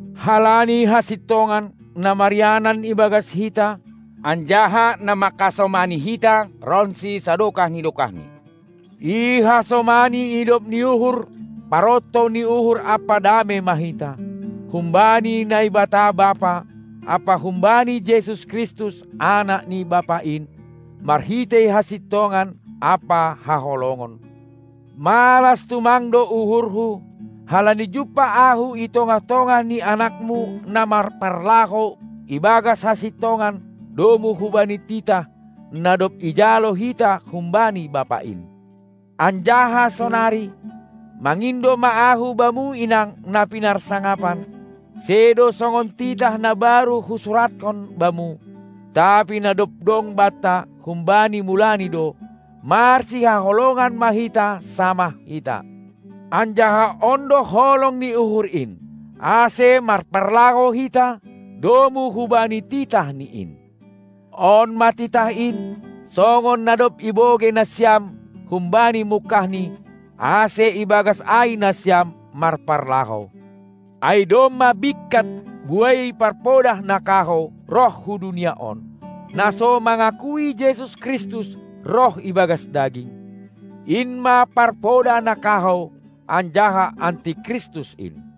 Halani hasintongan, na marianan ibagas hita, anjaha na manghasomani hita ronsi sadokah ni dokahni. Ihasomani idop ni uhur, parontou ni uhur ampa damei ma hita, humbani Naibata Bapa ampa humbani Jesus Kristus, anak ni Bapa in, marhitei hasintongan ampa haholongon. Malas tumang do uhurhu, halani jumpah ahu i tongah-tongah ni anakmu na marparlahou ibagas hasintongan domu hubani titah, na dob ijalo hita humbani Bapa in. Anjaha sonari, mangindo ma ahu bamu inang na pinarsangapan, sedo songon titah na baru husurathon bamu, tapi na dob dong banta humbani mulani do: Marsihaholongan ma hita samah hita. Anjaha on do holong ni uhur in, ase marparlahou hita domu hubani titahNi in. On ma titah in, songon na dob ibogei nasiam humbani mungkahni, ase ibagas ai nasiam marparlahou. Ai domma bingkat buei parpodah na kahou roh hu dunia on, na so mangakui Jesus Kristus roh ibagas daging. In ma parpodah na kahou anjaha Anti Kristus in.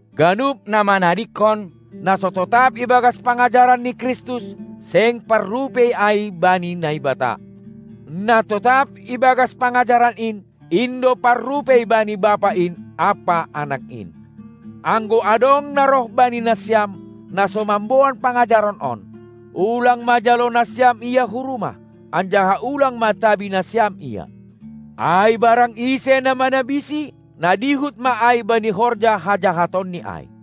Ganup na manadingkon, na so totap ibagas pangajaran ni Kristus, seng parrupei ai bani Naibata. Na totap ibagas pangajaran in, in do parrupei bani Bapa in ampa Anak in. Anggo adong na roh bani nasiam, na so mamboan pangajaran on, ulang ma jalo nasiam ia hu rumah, anjaha ulang ma tabi nasiam ia. Ai barang ise na manabisi, na dihut ma ai bani horja hajahatonni ai.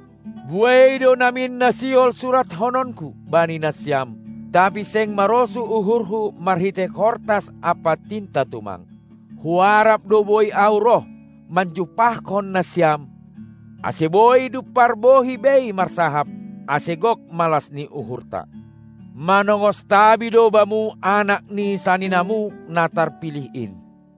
Buei do namin na sihol surathononku bani nasiam, tapi seng marosuh uhurhu marhitei kortas ampa tinta tumang, huarap do boi ahu roh manjumpahkon nasiam, ase boi dumpar bohi bei marsahap, ase gok malas ni uhurta. Manongos tabi do bamu anak ni saninamu, na tarpilih in.